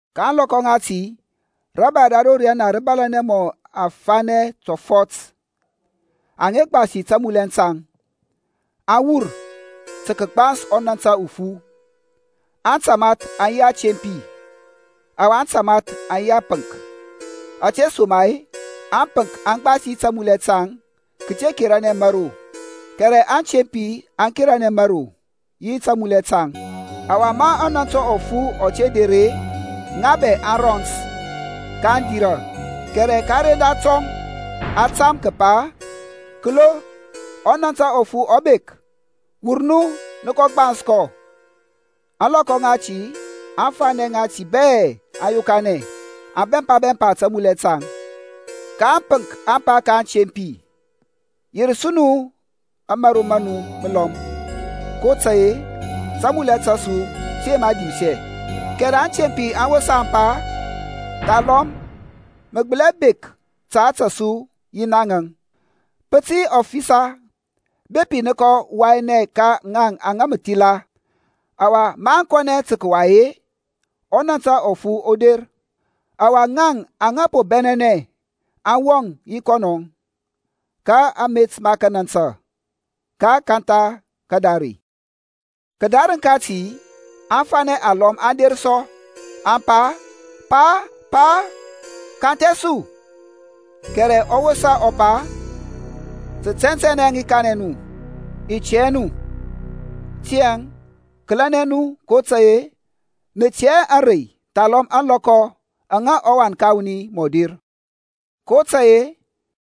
Ka ȧŋlɔkɔ ŋati rȧbȧy ra ro riyana rǝ tǝ bȧlȧnɛ mɔ afanɛ tɔfɔt aŋa gbasi tamulɛ taŋ, aŋ wur tǝ kǝgbans ɔnȧntȧ ufu. Antamath aŋ yi atempi, ɔwa aŋtamath aŋ yi apǝŋk, ȧtesoma-e ȧŋpǝnk aŋ gbasi tamulɛ taŋ kǝte keranɛ mȧro. Kɛrɛ aŋtempi aŋ keranɛ mȧro yi tamulɛ taŋ. Ɔwa ma ɔnȧntȧ ufu ɔ te der-e, ŋa bɛ aŋ rɔns, kaŋ dirȧ, kɛrɛ ka kǝrendatɔŋ a tam kǝpa, Kǝlo, ɔnȧntȧ ufu ɔ bek! Wur nu nǝ kɔ gbans kɔ. Ȧŋlɔkɔ ŋati aŋfanɛ ŋati bɛ aŋ yokanɛ, aŋ bɛmpa bɛmpa tamulɛ taŋ. Ka ȧŋpǝnk aŋ pa ka aŋtempi, Yer su nu ȧmȧro ma nu mǝlɔm, kotȧy-e tamulɛ ta su tǝ yema dimsɛ. Kɛrɛ aŋtempi aŋ wosa aŋ pa, Thalɔm mǝ gbǝli hɛ bek ta ȧtȧ su yi naŋ-e. Pǝ tǝ yi ɔfisa bepi nǝ kɔ wayanɛ ka ŋaŋ aŋa mǝ thila. Ɔwa maŋ kɔnɛ tǝ kǝway-e, ɔnȧntȧ ufu ɔ der. Ɔwa ŋaŋ aŋa po bɛnɛnɛ aŋ wɔŋ yi kɔnɔ ka amet ma kanantǝ; ka a kantha kadare. Kǝdarǝŋ kati aŋfanɛ alɔm aŋ der sɔ, aŋ pa, Pa, Pa, kanthɛ su. Kɛrɛ ɔ wosa ɔ pa, Tǝ tɛntɛnɛ i kanɛ nu, i tɛ hɛ nu. Tiyȧŋ kǝlɛnɛ nu kotȧy-e nǝ tɛ hɛ ȧŋrey thalɔm ȧŋlɔkɔ aŋa ɔWan ka wuni mɔ der. kotȧy-e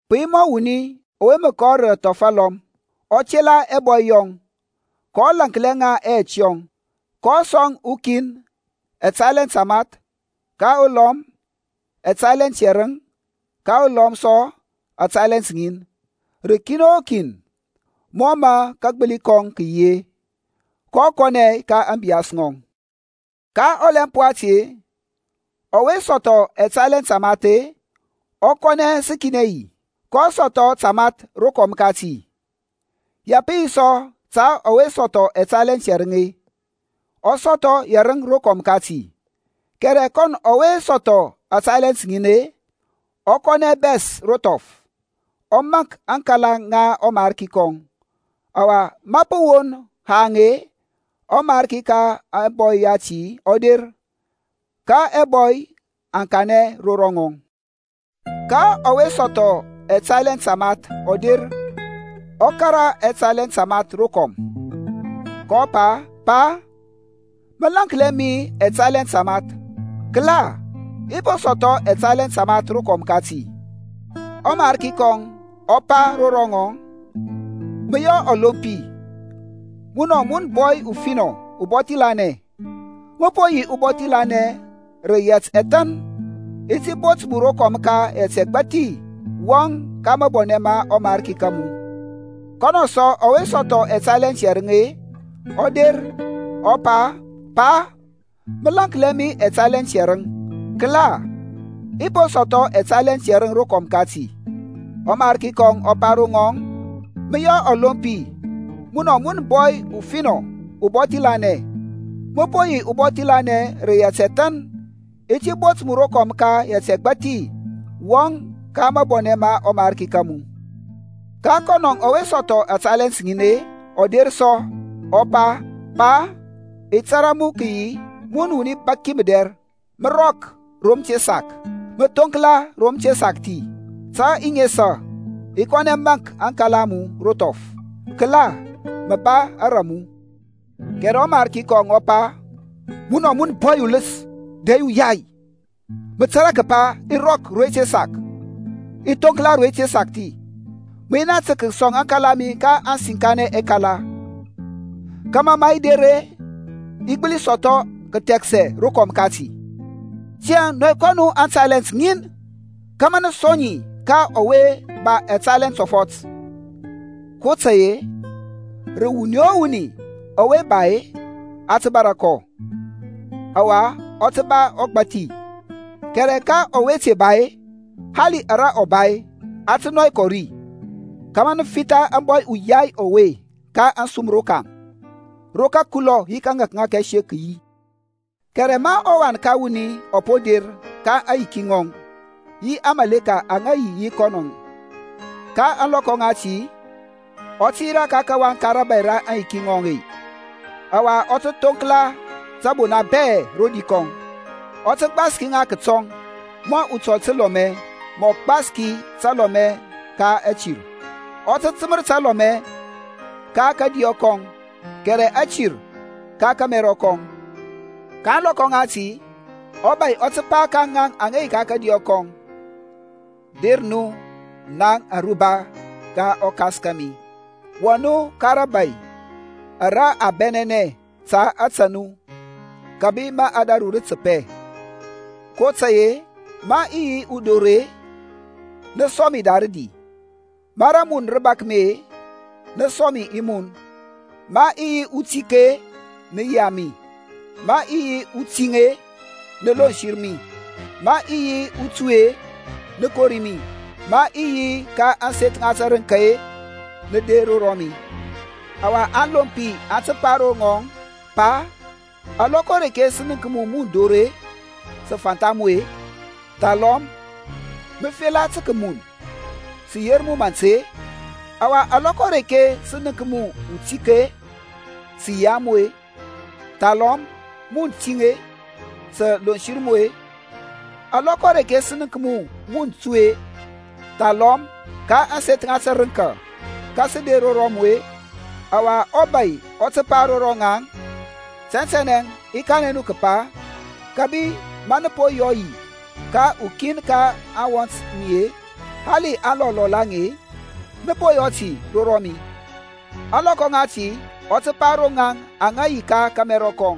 pǝ yi mɔ wuni ɔwe mǝ kɔ rǝ athɔf alɔm, ɔ tela ɛbɔy yɔŋ, kɔ laŋklia ŋa ɛyɛt yɔŋ. kɔ sɔŋ ukin ɛtalent tamath, ka ulɔm ɛtalent yɛrǝŋ, ka ulɔm sɔ atalent ŋin; rǝ ukin o kin mɔ mǝ kagbǝli kɔŋ kǝ yi-e. Kɔ kɔnɛ ka ȧŋbiyas ŋɔŋ. Ka ɔlɛmp wati-e, ɔwe sɔthɔ ɛtalent tamath-e, ɔ kɔnɛ ɔ sǝkinɛ yi, kɔ sɔthɔ tamath rokɔm kati. Ya pǝ yi sɔ ta ɔwe sɔthɔ ɛtalent yɛrǝŋ-e, ɔ sɔthɔ yɛrǝŋ rokɔm kati. Kɛrɛ kɔnɔ ɔwe sɔthɔ atalent ŋin-e, ɔ kɔnɛ ɔ bɛs ro thɔf, ɔ maŋk aŋkala ŋa ɔmarki kɔŋ. Ɔwa ma pǝ won haŋ-e, ɔmarki ka ɛbɔy yati ɔ der, ka ɛbɔy aŋ kanɛ ro ŋɔŋ. Ka ɔwe sɔthɔ ɛtalent tamath ɔ der ɔ kȧrȧ ɛtalent tamath ɛlɔm, kɔ pa, Pa, mǝ laŋklia mi ɛtalent tamath. Kǝla, i po sɔthɔ ɛtalent tamath rokɔm kati. Ɔmariki kɔŋ ɔ pa ro ŋɔŋ, Mǝ yɔ ɔlompi, munɔ mun bɔy ufinɔ ubɔthi lanɛ. Mǝ po yi ubɔthi lanɛ rǝ yɛt ɛthan. I ti bot mu rokɔm ka yɛt ɛgbathi. Wɔŋ ka mabɔnɛ ma ɔmarki ka mu. Kɔnɔ sɔ ɔwe sɔthɔ ɛtalent yɛrǝŋ-e, ɔ der ɔ pa, Pa, mǝ laŋklia mi ɛtalent yɛrǝŋ. Kǝla, i po sɔthɔ ɛtalent yɛrǝŋ rokɔm kati. Ɔmariki kɔŋ ɔ pa ro ŋɔŋ, Mǝ yɔ ɔlompi, munɔ mun bɔy ufinɔ ubɔthi lanɛ; mǝ po yi ubɔthi lanɛ rǝ yɛt ɛthan, i ti bot mu rokɔm ka yɛt ɛgbathi. Wɔŋ ka mabɔnɛ ma ɔmarki ka mu. Ka kɔnɔ ɔwe sɔthɔ atalent ŋin-e, ɔ der sɔ, ɔ pa, Pa, i tȧrȧ mu kǝyi wuni bȧk mǝdɛr, mǝ rɔk ro mǝ te sak, mǝ thoŋkla ro mǝ te sakthi. Tǝ i nesa, i kɔnɛ maŋk aŋkala a mu ro thɔf. Kǝla, mǝ ba ara mu. Kɛrɛ ɔmarki kɔŋ ɔ pa, Munɔ mun bɔy ulǝs dɛ yi uyai. Mǝ tȧrȧ kǝpa i rɔk ro i te sak, i thoŋkla ro i te sakthi. Mǝ yi naŋ tǝ kǝsɔŋ aŋkala a mi ka aŋsinkanɛ ɛkala, kȧmȧ ma i der-e, i gbǝli sɔthɔ kǝthɛksɛ rokɔm kati. Tiyȧŋ nɔy kɔ nu aŋtalent ŋin kȧmȧ nǝ sɔŋ ŋi ka ɔwe ba ɛtalent tɔfɔt. kotȧy-e rǝ wuni o wuni ɔwe ba-e a tǝ bȧrȧ kɔ, ɔwa ɔ tǝ ba ɔgbȧthi. Kɛrɛ ka ɔwe te ba-e, hali ara ɔ ba-e, a tǝ nɔy kɔ ri. Kama nǝ fitha ȧŋbɔy uyai ɔwe ka ȧŋsum rokaŋ. Ro kǝkulɔ yi kȧŋȧkŋȧk ɛsek kǝ yi. Kɛrɛ ma ɔWan ka wuni ɔ po der ka aŋyiki ŋɔŋ, yi aŋmȧleka aŋa yi yi kɔnɔȧŋ, ka ȧŋlɔkɔ ŋati ɔ tǝ yirȧ ka kawaŋ ka rȧbȧy ka aŋyiki ŋɔŋ-e, ɔwa ɔ tǝ thoŋkla tǝbona bɛ rodi kɔŋ. Ɔ tǝ gbaski ŋa kǝtɔŋ mɔ utɔl tǝlɔmɛ mǝ ɔ gbaski talɔmɛ ka atirȧŋ. Ɔ tǝ tǝmǝr talɔmɛ ka kȧdiyɔ kɔŋ, kɛrɛ atir ka kȧmɛrɔ kɔŋ. Ka ȧŋlɔkɔ ŋati ɔBȧy ɔ tǝ pa ro ŋaŋ ka kȧdiyɔ kɔŋ, Der nu naŋ aruba ŋa ɔKas kȧmi, wɔŋ nu ka rȧbȧy ara a bɛnɛnɛ ta ȧtȧ nu kǝbi ma ȧdȧru rǝ tǝpɛ. kotȧy-e ma i yi udor-e, nǝ sɔŋ mi da rǝdi. Ma rǝmun rǝ bȧk mi-e, nǝ sɔŋ mi i mun. Ma i yi utik-e, nǝ yia mi. Ma i yi utiŋ-e, nǝ lonsǝr mi. Ma i yi utuy-e, nǝ kori mi. Ma i yi ka ȧŋseth ŋa tǝrǝŋka-e, nǝ der ro mi. Ɔwa aŋlompi aŋ tǝ pa ro ŋɔŋ, Pa, alɔkɔ areke sǝ nənk mu mun dor-e, sǝ fantha mu-e, thalɔm mǝ fela tǝ kǝmun sǝ yer mu mant-e? Ɔwa alɔkɔ areke sǝ nənk mu utik-e, sǝ yia mu-e? Thalɔm, mun tiŋ-e, sǝ lonsǝr mu-e? Alɔkɔ areke sǝ nənk mu mun tuy-e, thalɔm ka ȧŋseth ŋa tǝrǝŋka, ka sǝ der ro mu-e? Ɔwa ɔbȧy ɔ tǝ pa ro ŋaŋ, Tɛntɛnɛ i kanɛ nu kǝpa, kǝbi ma nǝ po yɔ yi ka ukin ka aŋwɔnt mi-e, hali aŋlɔl lɔl aŋe-e, nǝ po yɔ ti ro rɔmi. Ȧŋlɔkɔ ŋati ɔ tǝ pa ro ŋaŋ aŋa yi ka kȧmɛrɔ kɔŋ,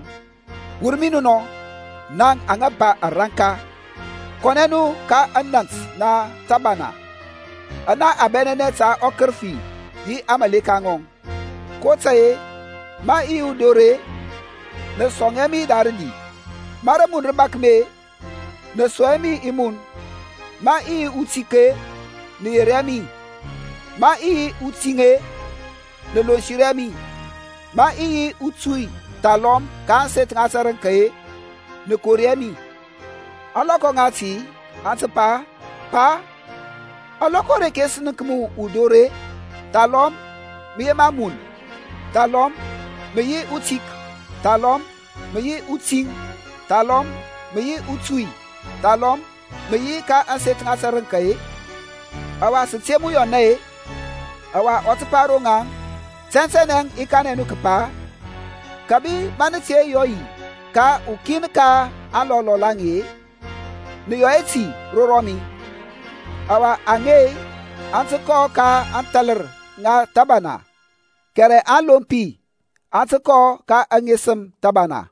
wur mi nɔ naŋ aŋa ba ȧranka, kɔnɛ nu ka anant na tǝbana ana a bɛnɛnɛ ta ɔkǝrǝfi yi aŋmȧleka ŋɔŋ. kotȧy-e, ma i yi udor-e, nǝ sɔŋ hɛ mi da rǝdi. Ma rǝmun rǝ bȧk mi-e, nǝ sɔŋ hɛ mi i mun. Ma i yi utik-e nǝ yer hɛ mi. Ma i yi utiŋ-e, nǝ lonsǝr hɛ mi. Ma i yi utui thalɔm ka ȧŋseth ŋa tǝrǝŋka-e, nǝ kori hɛ mi. Ȧŋlɔkɔ ŋati aŋ tǝ pa, Pa, alɔkɔ areke sǝ nənk mu udor-e, thalɔm mǝ yema mun, thalɔm mǝ yi utik, thalɔm mǝ yi utiŋ, thalɔm mǝ yi utui, thalɔm mǝ yi ka ȧŋseth ŋa tǝrǝŋka-e, ɔwa sǝ te mu yɔna-e? Ɔwa ɔ tǝ pa ro ŋaŋ, Tɛntɛnɛ i kanɛ nu kǝpa, kǝbi ma nǝ te yɔ yi ka ukin ka aŋlɔl lɔl aŋe-e, nǝ yɔ hɛ ti ro rɔmi. Ɔwa aŋe aŋ tǝ kɔ ka athalǝr ŋa thǝbana, kɛrɛ aŋlompi aŋ tǝ kɔ ka aŋesǝm thǝbana.